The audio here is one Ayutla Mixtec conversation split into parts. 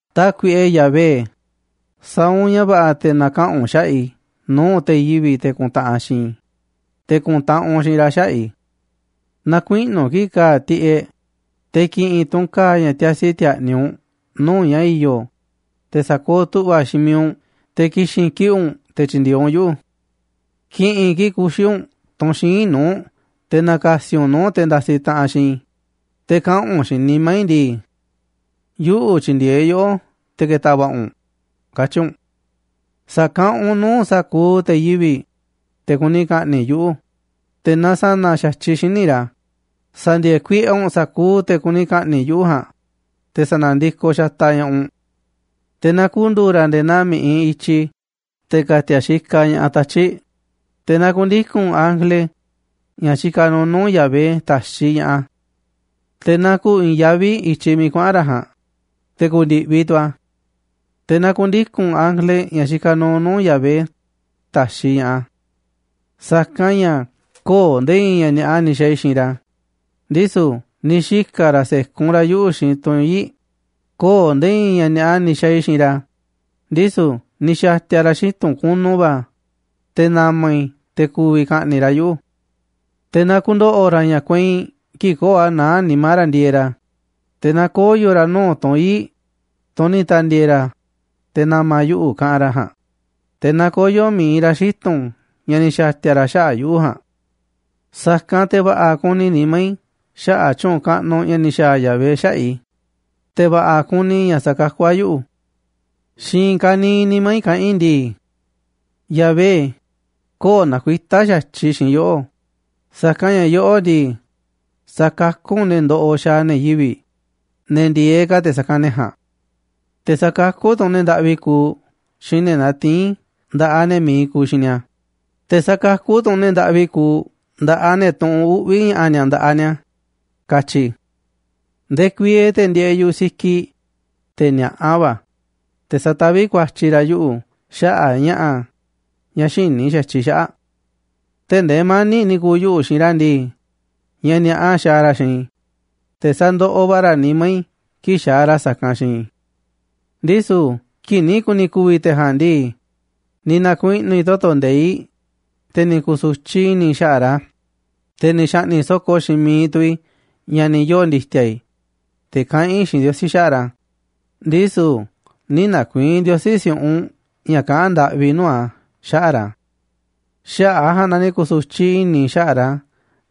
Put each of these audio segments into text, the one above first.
Tákuiꞌe Yahvé, sa̱a̱ u̱nꞌ ña̱ va̱ꞌa̱ te̱ na̱kaꞌa̱n u̱nꞌ xaꞌa̱ꞌ i̱ nuu̱ꞌ te̱ yivi̱ꞌ, te̱ kuntaꞌanꞌ xiinꞌ i̱, te̱ ku̱ntaꞌanꞌ u̱nꞌ xiinꞌ ra̱ xaꞌa̱ꞌ i̱. Na̱kuiꞌnu̱ kiꞌi̱ꞌ ka̱a̱ tiꞌeꞌ, te̱ ki̱ꞌi̱n tu̱ u̱nꞌ ka̱a̱ ña̱ tiasi ti̱a̱ꞌni̱ u̱nꞌ nuu̱ꞌ ña̱ i̱yo̱, te̱ sa̱kooꞌ tu̱ꞌva̱ xiinꞌ miiꞌ u̱nꞌ te̱ ki̱xi̱n kiꞌi̱ꞌ u̱nꞌ te̱ tyi̱ndi̱e̱eꞌ u̱nꞌ yuꞌu̱. Ki̱ꞌi̱n kiꞌi̱ꞌ kuxi̱ u̱nꞌ tunꞌ xíinꞌ nuu̱ꞌ te̱ na̱ka̱si̱ u̱nꞌ nuu̱ꞌ te̱ ndasiꞌ taꞌanꞌ xiinꞌ i̱, te̱ kaꞌa̱n u̱nꞌ xiinꞌ nimá i̱ ndii: “Yuꞌu̱ tyi̱ndi̱e̱eꞌ yoꞌó te̱ ke̱ta̱ va̱ꞌa̱ u̱nꞌ”, katyi̱ u̱nꞌ. Sa̱kaꞌanꞌ u̱nꞌ nuu̱ꞌ sa̱kuuꞌ te̱ yivi̱ꞌ, te̱ kuni ka̱ꞌni̱ꞌ yuꞌu̱, te̱ na sa̱na̱ xa̱tyiꞌ xíniꞌ ra̱, sa̱ndi̱e̱e̱ kuiꞌe u̱nꞌ sa̱kuuꞌ te̱ kuni ka̱ꞌni̱ꞌ yuꞌu̱ ja̱a̱nꞌ, te̱ sa̱na̱ndikoꞌ xataꞌ ña̱ꞌaꞌ u̱nꞌ. Te̱ na ku̱ndu̱u̱ ra̱ nde̱e̱ naa mi̱ꞌiꞌ i̱tyi, te̱ ka̱ti̱a̱ xikaꞌ ña̱ꞌaꞌ tatyi̱ꞌ, te̱ na ku̱ndiku̱n ángele, ña̱ xikaꞌ nuuꞌ nuu̱ꞌ Yahvé, ta̱xiꞌ ña̱ꞌaꞌ a̱. Te̱ na ku̱u̱ i̱i̱n yaví i̱tyiꞌ miiꞌ kuaꞌa̱n ra̱ ja̱a̱nꞌ, te̱ ku̱ndi̱ꞌviꞌ tu̱ a̱. Te̱ na ku̱ndiku̱n ángele, ña̱ xikaꞌ nuuꞌ nuu̱ꞌ Yahvé, ta̱xiꞌ ña̱ꞌaꞌ a̱. Sa̱kanꞌ ña̱ köo̱ꞌ nde̱e̱ i̱i̱n ña̱ ni̱a̱ꞌa ni̱ xa̱a̱ i̱ xiinꞌ ra̱, ndisu̱ ni̱ xika̱ ra̱ se̱kun ra̱ yuꞌu̱ xiinꞌ tunꞌ ii̱ꞌ, köo̱ꞌ nde̱e̱ i̱i̱n ña̱ ni̱a̱ꞌa ni̱ xa̱a̱ i̱ xiinꞌ ra̱, ndisu̱ ni̱ xa̱ti̱a̱ ra̱ xitu̱n kunu va̱ te̱ na̱ma̱ i̱, te̱ ku̱vi̱ ka̱ꞌni̱ꞌ ra̱ yuꞌu̱. Te̱ na ku̱ndo̱ꞌo̱ ra̱ ña̱ kueinꞌ kii̱ꞌ köo̱ꞌ a̱ naá nimá ra̱ ndieeꞌ ra̱, te̱ na koyo̱ ra̱ nuu̱ꞌ tunꞌ ii̱ꞌ, tunꞌ ni̱ ta̱ndi̱e̱e̱ ra̱, te̱ na̱ma̱ yuꞌu̱ kaꞌanꞌ ra̱ ja̱a̱nꞌ, te̱ na koyo̱ mi̱iꞌ ra̱ xitu̱n ña̱ ni̱ xa̱ti̱a̱ ra̱ xaꞌa̱ꞌ yuꞌu̱ ja̱a̱nꞌ. Sa̱kanꞌ te̱ va̱ꞌa̱ ku̱ni̱ nimá i̱ xaꞌa̱ꞌ tyu̱u̱n kaꞌnuꞌ ña̱ ni̱ xa̱a̱ Yahvé xaꞌa̱ꞌ i̱, te̱ va̱ꞌa̱ ku̱ni̱ i̱ ña̱ sakakú a̱ yuꞌu̱. Xiinꞌ i̱i̱n ka̱niiꞌ nimá i̱ kaꞌán i̱ ndii: “Yahvé, köo̱ꞌ nakuitá xa̱tyiꞌ xiinꞌ yoꞌó, sa̱kanꞌ ña̱ yoꞌó ndii, sakakú u̱nꞌ ne̱ ndoꞌoꞌ xaaꞌ ne̱ yivi̱ꞌ, ne̱ ndi̱e̱eꞌ ka̱ te̱ sa̱kanꞌ ne̱ ja̱a̱nꞌ. Te̱ sa̱kakú tu̱ u̱nꞌ ne̱ ndaꞌvi kuuꞌ xiinꞌ ne̱ natiín nda̱ꞌaꞌ ne̱ mi̱iꞌ kuuꞌ xiinꞌ ni̱a̱, te̱ sakakú tu̱ u̱nꞌ ne̱ ndaꞌvi kuuꞌ nda̱ꞌaꞌ ne̱ tuꞌunꞌ uꞌvi̱ ña̱ꞌa̱ ni̱a̱ nda̱ꞌaꞌ ni̱a̱”, katyi̱ i̱. Ndekuieeꞌ te̱ ndieeꞌ yu̱ꞌuꞌ sikiꞌ, te̱ ni̱a̱ꞌa va̱, te̱ sataví ku̱a̱tyi̱ ra̱ yuꞌu̱ xaꞌa̱ꞌ ña̱ꞌa̱ ña̱ xïní xa̱tyiꞌ i̱ xaꞌa̱ꞌ. Tee̱ꞌ ndee mani̱ꞌ ni̱ ku̱u̱ yuꞌu̱ xiinꞌ ra̱ ndii, ña̱ ni̱a̱ꞌa xaaꞌ ra̱ xiinꞌ i̱, te̱ sandoꞌoꞌ va̱ ra̱ nimá i̱ kii̱ꞌ xaaꞌ ra̱ sa̱kanꞌ xiinꞌ i̱. Ndisu̱ kii̱ꞌ ni̱ ku̱ni̱ ku̱vi̱ te̱ ja̱a̱nꞌ ndii, ni̱ na̱kuiꞌnu̱ i̱ toto̱ nde̱iꞌ, te̱ ni̱ ku̱su̱tyiꞌ i̱ni̱ i̱ xaꞌa̱ꞌ ra̱, te̱ ni̱ xa̱ꞌni̱ꞌ so̱ko̱ xiinꞌ miiꞌ tu̱ i̱ ña̱ ni̱ yoo̱ ndi̱ti̱a̱ i̱, te̱ kaꞌán i̱ xiinꞌ Ndiosí xaꞌa̱ꞌ ra̱, ndisu̱ nï̱ na̱ku̱i̱i̱n Ndiosí si̱u̱ꞌunꞌ ña̱ kaꞌán ndaꞌvi i̱ nuu̱ꞌ a̱ xaꞌa̱ꞌ ra̱. Xaꞌa̱ꞌ a̱ ja̱a̱nꞌ na ni̱ ku̱su̱tyiꞌ i̱ni̱ i̱ xaꞌa̱ꞌ ra̱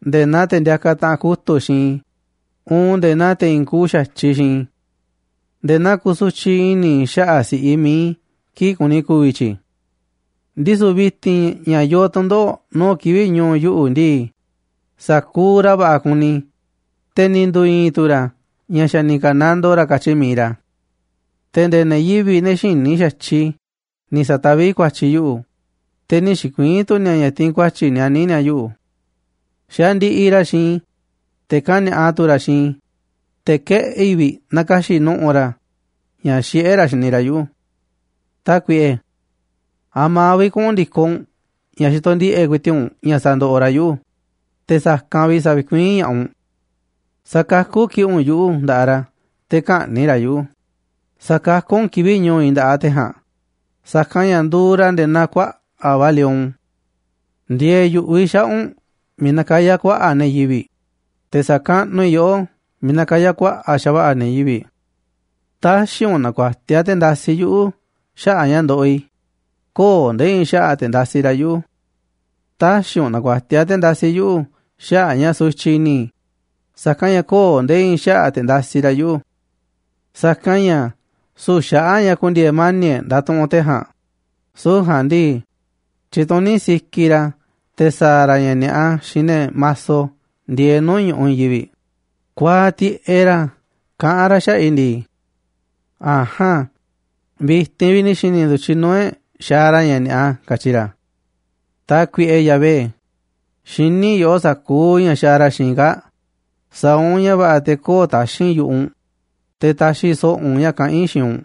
nde̱e̱ naa te̱ ndiakaꞌ taꞌanꞌ kutu̱ꞌ xiinꞌ i̱ uun nde̱e̱ naa i̱i̱n te̱ i̱i̱n kuuꞌ xa̱tyiꞌ xiinꞌ i̱. Nde̱e̱ naa kusutyiꞌ i̱ni̱ i̱ xaꞌa̱ꞌ si̱ꞌiꞌ mi̱iꞌ i̱ kii̱ꞌ kuni ku̱vi̱ tyi̱ꞌ. Ndisu̱ vi̱ti̱n ña̱ yoo tu̱ndoꞌo̱ꞌ nuu̱ꞌ kivi̱ꞌ ñu̱u̱ yuꞌu̱ ndii, sa̱kuuꞌ ra̱ va̱ꞌa̱ kuni, te̱ ni̱ ndu̱u̱ i̱i̱n tu̱ ra̱ ña̱ xa̱ ni̱ ka̱nandoo ra̱ katyi mi̱iꞌ ra̱. Te̱ nde̱e̱ ne̱ yivi̱ꞌ, ne̱ xïní xa̱tyiꞌ i̱ ni̱ sa̱taví ku̱a̱tyi̱ yuꞌu̱, te̱ nï̱ xi̱kuii̱n tu̱ ni̱a̱ ña̱ tiinꞌ ku̱a̱tyi̱ nianí ni̱a̱ yuꞌu̱. Xandiꞌiꞌ ra̱ xiinꞌ i̱, te̱ kani̱a̱ꞌa tu̱ ra̱ xiinꞌ i̱, te̱ keꞌi̱ꞌ vi̱ꞌ na̱ka̱xi̱ꞌ nu̱ꞌu̱ ra̱ ña̱ xiꞌé ra̱ xini ra̱ yuꞌu̱. Tákuiꞌe, ¿a̱ma̱ vi̱ꞌ kuꞌu̱n ndi̱koꞌ u̱nꞌ ña̱ xitoꞌ ndiꞌe̱ꞌ ku̱i̱ti̱ꞌ u̱nꞌ ña̱ sandoꞌoꞌ ra̱ yuꞌu̱, te̱ sa̱kanꞌ vi̱ꞌ sa̱vi̱kuiín ña̱ꞌaꞌ u̱nꞌ? Sa̱kakú kiꞌi̱ꞌ u̱nꞌ yuꞌu̱ nda̱ꞌaꞌ ra̱ te̱ kä̱ꞌni̱ꞌ ra̱ yuꞌu̱, sa̱kakú u̱nꞌ kivi̱ꞌ ñu̱u̱ i̱ nda̱ꞌaꞌ te̱ ja̱a̱nꞌ, sa̱kanꞌ ña̱ nduuꞌ ra̱ nde̱e̱ naa kuaꞌa̱ꞌ va̱ lion. Ndi̱e̱e̱ yu̱ꞌuꞌ i̱ xaꞌa̱ꞌ u̱nꞌ miiꞌ nakayá kuaꞌa̱ꞌ ne̱ yivi̱ꞌ, te̱ sa̱kaꞌnuꞌ i̱ yoꞌó miiꞌ nakayá kuaꞌa̱ꞌ xa̱va̱ꞌa̱ ne̱ yivi̱ꞌ. Tä̱xi̱ u̱nꞌ na̱ku̱a̱tiaꞌ te̱ ndasiꞌ yuꞌu̱ xaꞌa̱ꞌ ña̱ ndoꞌoꞌ i̱, köo̱ꞌ nde̱e̱ i̱i̱n xaꞌa̱ꞌ te̱ ndasiꞌ ra̱ yuꞌu̱. Tä̱xi̱ u̱nꞌ na̱ku̱a̱tiaꞌ te̱ ndasiꞌ yuꞌu̱ xaꞌa̱ꞌ ña̱ sutyiꞌ i̱ni̱ i̱, sa̱kanꞌ ña̱ köo̱ꞌ nde̱e̱ i̱i̱n xaꞌa̱ꞌ te̱ ndasiꞌ ra̱ yuꞌu̱. Sa̱kanꞌ ña̱ süu̱ꞌ xaꞌa̱ꞌ ña̱ ku̱ndi̱e̱e̱ mani̱ꞌ e̱ꞌ ndatuꞌunꞌ te̱ ja̱a̱nꞌ, süu̱ꞌ ja̱a̱nꞌ ndii, tyituní sikiꞌ ra̱ te̱ sa̱a̱ ra̱ ña̱ ni̱a̱ꞌa xiinꞌ ne̱ maso ndieeꞌ nuu̱ꞌ ñu̱ꞌuꞌ i̱i̱n yivi̱ꞌ. Kuaaꞌ tiꞌeꞌ ra̱, kaꞌán ra̱ xaꞌa̱ꞌ i̱ ndii: “A̱jaan, vi̱ti̱n vi̱ꞌ ni̱ xi̱ni̱ ndu̱tyiꞌ nuu̱ꞌ e̱ꞌ xaaꞌ ra̱ ña̱ ni̱a̱ꞌa”, katyi ra̱. Tákuiꞌe Yahvé, xiní yoꞌó sa̱kuuꞌ ña̱ xaaꞌ ra̱ xiinꞌ i̱ kaa̱ꞌ, sa̱a̱ u̱nꞌ ña̱ va̱ꞌa̱ te̱ köo̱ꞌ taxi̱nꞌ yu̱ꞌuꞌ u̱nꞌ, te̱ ta̱xi̱ so̱ꞌo̱ u̱nꞌ ña̱ kaꞌán i̱ xiinꞌ u̱nꞌ.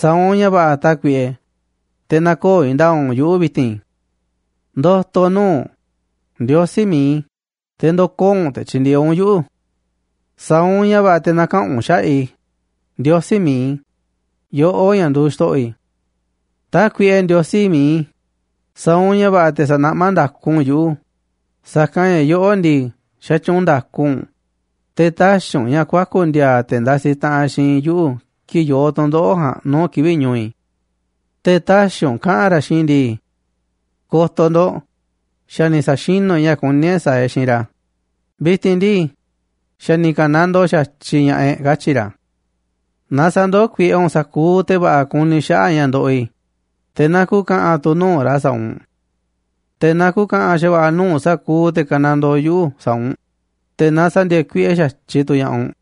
Sa̱a̱ u̱nꞌ ña̱ va̱ꞌa̱, Tákuiꞌe, te̱ nä̱ko̱o̱ i̱i̱n nda̱a̱ꞌ u̱nꞌ yuꞌu̱ vi̱ti̱n. Ndo̱to̱ nuu̱ꞌ u̱nꞌ, Ndiosí mi̱iꞌ i̱, te̱ ndo̱koo̱ u̱nꞌ te̱ tyi̱ndi̱e̱eꞌ u̱nꞌ yuꞌu̱. Sa̱a̱ u̱nꞌ ña̱ va̱ꞌa̱ te̱ na̱kaꞌa̱n u̱nꞌ xaꞌa̱ꞌ i̱, Ndiosí mi̱iꞌ i̱, yoꞌó ña̱ nduuꞌ xto̱ꞌo̱ i̱. Tákuiꞌe Ndiosí miiꞌ i̱, sa̱a̱ u̱nꞌ ña̱ va̱ꞌa̱ te̱ sa̱naꞌmá nda̱ku u̱nꞌ yuꞌu̱, sa̱kanꞌ ña̱ yoꞌó ndii, xatyuunꞌ nda̱ku u̱nꞌ, te̱ tä̱xi̱ u̱nꞌ ña̱ kuaku̱ ndi̱a̱a̱ te̱ ndasiꞌ taꞌanꞌ xiinꞌ i̱ yuꞌu̱ kii̱ꞌ yoo tu̱ndoꞌo̱ꞌ ja̱a̱nꞌ nuu̱ꞌ kivi̱ꞌ ñu̱u̱ i̱. Te̱ tä̱xi̱ u̱nꞌ kaꞌa̱n ra̱ xiinꞌ i̱ ndii: “Ko̱to̱ ndo̱ꞌ, xa̱ ni̱ sa̱xinú e̱ꞌ ña̱ kuní e̱ꞌ sa̱a̱ e̱ꞌ xiinꞌ ra̱, vi̱ti̱n ndii, xa̱ ni̱ ka̱nandoo xa̱tyiꞌ ña̱ꞌaꞌ e̱ꞌ”, katyi̱ ra̱. Na sa̱ndoó kuiꞌe u̱nꞌ sa̱kuuꞌ te̱ va̱ꞌa̱ kuni xaꞌa̱ꞌ ña̱ ndoꞌoꞌ i̱, te̱ na ku̱ka̱ꞌa̱n tu̱ nuu̱ꞌ ra̱ sa̱a̱ u̱nꞌ. Te̱ na ku̱ka̱ꞌa̱n xa̱va̱ꞌa̱ nuu̱ꞌ sa̱kuuꞌ te̱ ka̱nandoo yuꞌu̱ sa̱a̱ u̱nꞌ, te̱ na sa̱ndi̱e̱e̱ kuiꞌe xa̱tyiꞌ tu̱ ña̱ꞌaꞌ u̱nꞌ.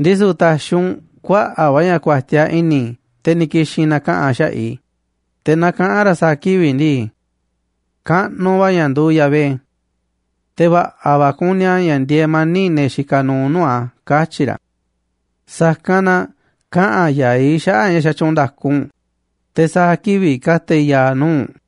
Ndisu̱ ta̱xi̱ u̱nꞌ kuaꞌa̱ꞌ va̱ ña̱ ku̱a̱tiaꞌ i̱ni̱ te̱ ni̱ ki̱xi̱n na̱kaꞌa̱n xaꞌa̱ꞌ i̱, te̱ na kaꞌa̱n ra̱ sa̱a̱ kivi̱ꞌ ndii: “Kaꞌnuꞌ va̱ ña̱ nduuꞌ Yahvé. Te̱ va̱ꞌa̱ va̱ kuni a̱ ña̱ ndieeꞌ mani̱ꞌ ne̱ xikaꞌ nuuꞌ nuu̱ꞌ a̱”, katyi̱ ra̱. Sa̱kanꞌ na kaꞌa̱n ya̱aꞌ i̱ xaꞌa̱ꞌ ña̱ xatyuunꞌ nda̱ku u̱nꞌ, te̱ sa̱a̱ kivi̱ꞌ ka̱ta̱ i̱ ya̱a̱ nuu̱ꞌ u̱nꞌ.